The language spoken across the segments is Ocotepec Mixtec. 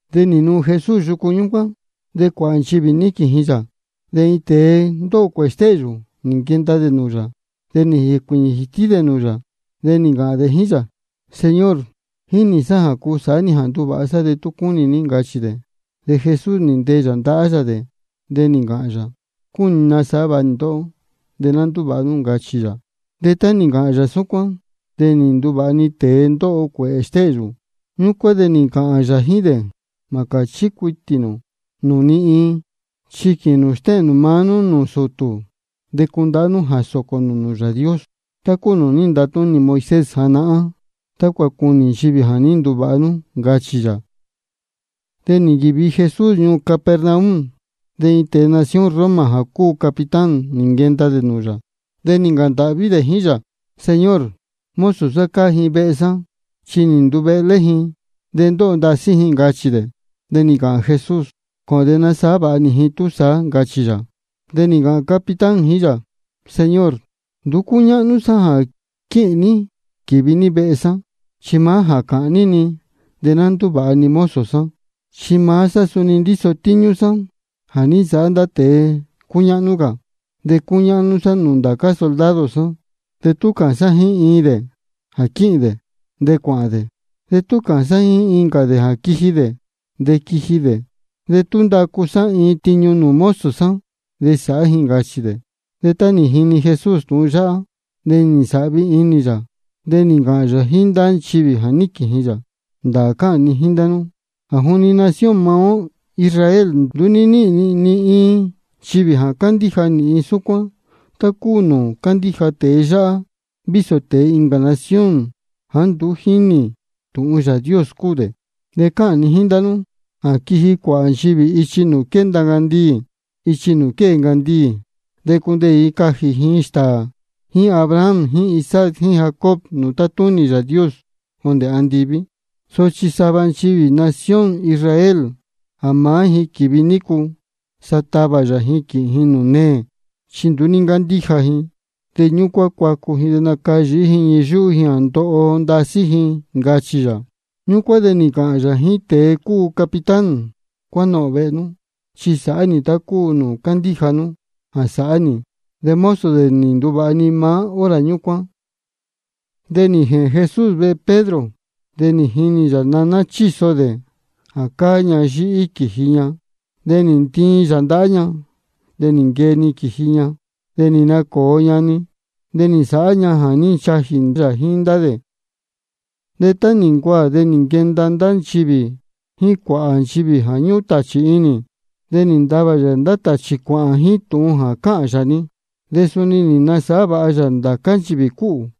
De nī nuu Jesús yucu ñúcuán, de cuāhā nchivī níquīn ji yā. De iin tēe ndóho cuēhē stéhyū, nī nquenda dē nūū yā. De nī jēcuīñī jītí dē nūū yā, de nī ncāhān dē jíín yā: Señor, jínī sá jā cuu sāhá ní jā nduvāha sá, de tú cúnī ní, ncachī dē. De Jesús nī ntee yā ndahá yā dē, de nī ncāhān yā: Cúnī ni nasāhá vāha nī ndóhó. De ná ndúvāha nú, ncachī yā. De tá nī ncāhān yā súcuán, de nī nduvāha-ni tēe ndóho cuēhē stéhyū. Ñúcuán de nī ncāhān yā jíín dē: Mā cāchí cuitī nū nūū ni iin. Chi quīhīn nū stéhēn nū maá nú nūū sūtū, de cundahá nú jā sōcō nū nūū Yāā Dios, tá cúu nūū ní ntatúnī Moisés janahán, tácua cunī nchivī jā ní nduvāha nú, ncachī yā. De nī nquīvi Jesús ñuū Capernaum. De iin tēe nación Roma jā cúu capitán, nī nquenda dē nūū yā, de nī ncāhān ndāhví dē jíín yā: Señor, mozo sá cáá ji vehe sá, chi nī nduvehlé ji de ndóho ndasí ji, ncachī dē. De nī ncāhān Jesús: Cōhōn de nasāhá vāha nī ji túsaá, ncachī yā. De nī ncāhān capitán jíín yā: Señor, nduú cúñáhnú sá jā quíhīn ní quīvi ní vehe sá. Chi maá jā cāhān ní-ni, de ná ndúvāha-ni mozo sá. Chi maá sá suni ndíso tíñú sá jā ní nsāhá ndá tēe cúñáhnú cā. De cúñáhnú sá nūū ndācá soldado sá. De tú cāhān sá jíín iin dē jā quíhīn dē, de cuāhān dē. De tú cāhān sá jíín incā dē jā quiji dē, de quíji dē. De tú ndacu sá iin tiñu nūū mozo sá, de sáhá ji, ncachī dē. De tá nī jini Jesús tūhun yáhá, de nī nsāhvi inī yā. De nī ncāhān yā jíín ndá nchivī jā níquīn ji yā: Ndāā cáhān ni jíín ndá nú jā juni nación maá ó Israel nduú ní níhīn ni ni iin nchivī jā cándíja nīhin súcuán, tá cúu nūū cándíja tēe yáhá, vísō tēe incā nación jāá nduú jínī tūhun Yāā Dios cúu dē. De cáhān ni jíín ndá nú jā quiji cuāhā nchivī ichi nūū quénda ncandiī jíín ichi nūū quée ncandiī. De cundeē ji cajī ji stāā jíín Abraham jíín Isaac jíín Jacob nūū tátúnī Yāā Dios jondē andiví. Sochi sava nchivī nación Israel jā maá ji quīvi nícu, sa tavā yā ji quīhīn ji nūū neē, chi nduú ní ncándíja ji. De ñúcuán cuacu ji de nacayīhí ji ñii yúhú ji jā ndoho ndasí ji, ncachī yā. Ñúcuán de nī ncāhān yā jíín tēe cúu capitán: Cuánohōn vehe nú, chi sāhá nī tá cúu nūū cándíja nú jā sāhá nī. De mozo dē nī nduvāha ji-ni maá hora ñúcuán. De nī jēhēn Jesús vehe Pedro. De nī jinī yā naná chíso dē jā cáá ña yíhí quīji ña. De nī ntiin yā ndahá ña, de nī nquee-ni quīji ña. De nī nacōo ña-ni, de nī nsāhá ña jā ní nchajī yā jíín ndá dē. De tá nī ncuaā de nī nquenda ndá nchivī jíín cuāhā nchivī jā ñúhún tāchī inī. De nī ntavā yā ndá tāchī cuāhān jíín tūhun jā cáhān yā-ni. De suni nī nasāhá vāha yā ndācá nchivī cúhū.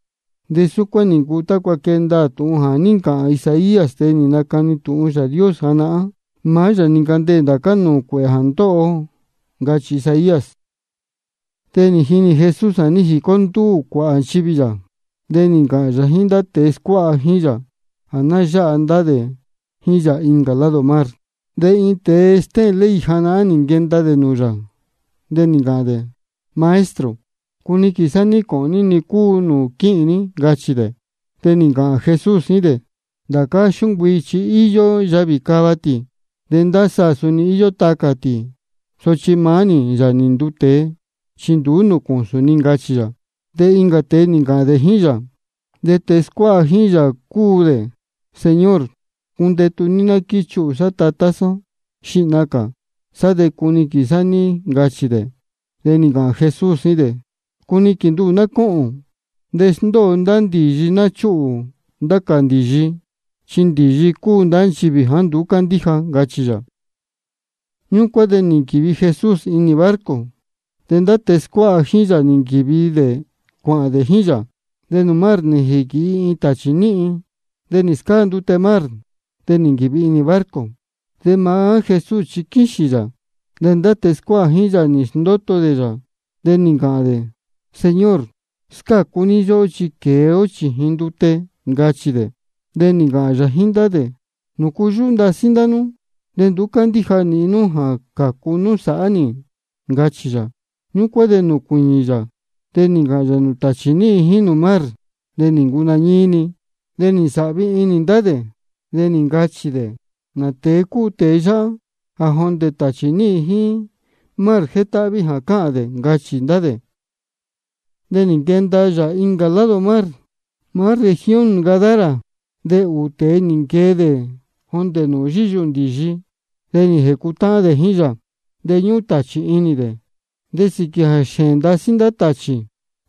De súcuán nī ncuu tácua quee ndaā tūhun jā ní ncāhān Isaías, tēe nī nacani tūhun Yāā Dios janahán: Maá yā nī ncandeē ndācá nūū cuēhē jā ndóho ó, ncachī Isaías. De nī jinī Jesús jā ní jicó ndúū cuāhā nchivī yā. De nī ncāhān yā jíín ndá tēe scuáha jíín yā jā ná yáha ndá dē jíín yā incā lado mar. De iin tēe stéhēn ley janahán nī nquenda dē nūū yā, de nī ncāhān dē: Maestro, cuniquīn sá ní cōhōn ní-ni cúu nūū quíhīn ní, ncachī dē. De nī ncāhān Jesús jíín dē: Ndācá xúncuii chi íyó yavī cava tī, de ndá saā suni íyó tacā tī. Sochi maá nī, Yāā nī nduu tēe, nduú nūū cūsūn ni, ncachī yā. De incā tēe nī ncāhān dē jíín yā, de tēe scuáha jíín yā cúu dē: Señor, cundetū ní de ná quíchiyuhū sá tatá sá xihna cā. Sá de cuniquīn sá níhín, ncachī dē. De nī ncāhān Jesús jíín dē: Cuniquīn nduhū ná cóhōn. De sndóo ndá ndīyi ná chúhū ndá cā ndīyi, chi ndīyi cúu ndá nchivī jāá nduú cándíja, ncachī yā. Ñúcuán de nī nquīvi Jesús inī barco, de ndá tēe scuáha jíín yā nī nquīvi dē cuāhān dē jíín yā. De nūū mar nī jīquīhi iin tāchī níhin, de nī scáa ndute mar, de nī nquīvi inī barco. De maá Jesús chi quíxīn yā. De ndá tēe scuáha jíín yā nī sndóto dē yā, de nī ncāhān dē: Señor, scácu ní yóhó, chi quēe ó chījin ndute, ncachī dē. De nī ncāhān yā jíín ndá dē: ¿Nūcu yúhú ndasí ndá nú? De nduú cándíja nīhin nú jā cācu nú sāhá nī, ncachī yā. Ñúcuán de nī nacuiñī yā, de nī ncāhān yā nūū tāchī níhin jíín nūū mar. De nī ncuu nañíí-ni. De nī nsāhvi inī ndá dē, de nī ncāhān dē: ¿Nā tēe cúu tēe yáhá, jā jondē tāchī níhin jíín mar jétáhví jā cáhān dē? ncachī ndá dē. De nī nquenda yā incā lado mar, maá región nchivī Gadara. De ūū tēe nī nquee dē jondē nūū yíyuhū ndīyi, nī jēcutáhán dē jíín yā. De ñúhún tāchī inī dē, de sīquī jā xēēn ndasí ndá tāchī,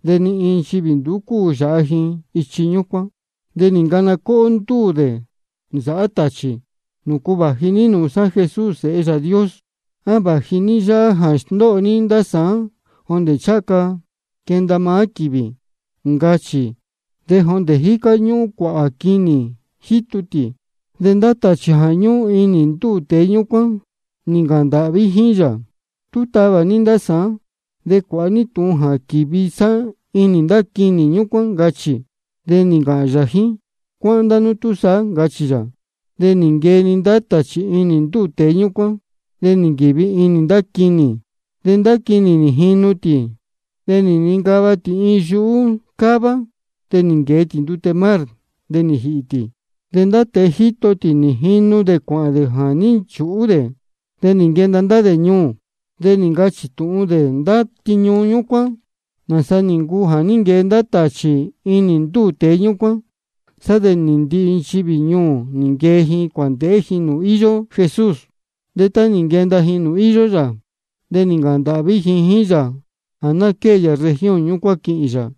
de ni iin nchivī nduú cúu yāha ji ichi ñúcuán. De nī ncana cóhó ndúū dē nī nsāhá tāchī: ¿Nūcu vāji ní nūū sá, Jesús Sēhe Yāā Dios? ¿A vāji ní yáhá jā sndóho ní sāán jondē ncháha ca quenda maá quīvī? ncachī. De jondē jícá jacū ñúhún cuāhā quinī jítu tī. De ndá tāchī jā ñúhún inī ndúū tēe ñúcuán, nī ncāhān ndāhví jíín yā: Tú tavā ní ndá sá, de cuāha ní tūhun jā quīvi sá inī ndá quinī ñúcuán, ncachī. De nī ncāhān yā jíín: Cuáhán túsaá, ncachī yā. De nī nquee ndá tāchī inī ndúū tēe ñúcuán, de nī nquīvi inī ndá quinī. De ndá quinī nī jinu tī de nī nincava tī iin yuhú cává, de nī nquēe tī ndute mar, de nī jīhī tī. De ndá tēe jíto tī nī jinu dē cuāhān dē jā ní nchūhú dē. De nī nquenda ndá dē ñuū, de nī ncachī tūhun dē ndá tiñu ñúcuán, nāsa nī ncuu jā ní nquee ndá tāchī inī ndúū tēe ñúcuán. Sá de ndihi nchivī ñuū nī nquee ji cuāndēhé ji nūū íyó Jesús. De tá nī nquenda ji nūū íyó yā, de nī ncāhān ndāhví ji jíín yā jā ná quée yā región ñúcuán quīhīn yā.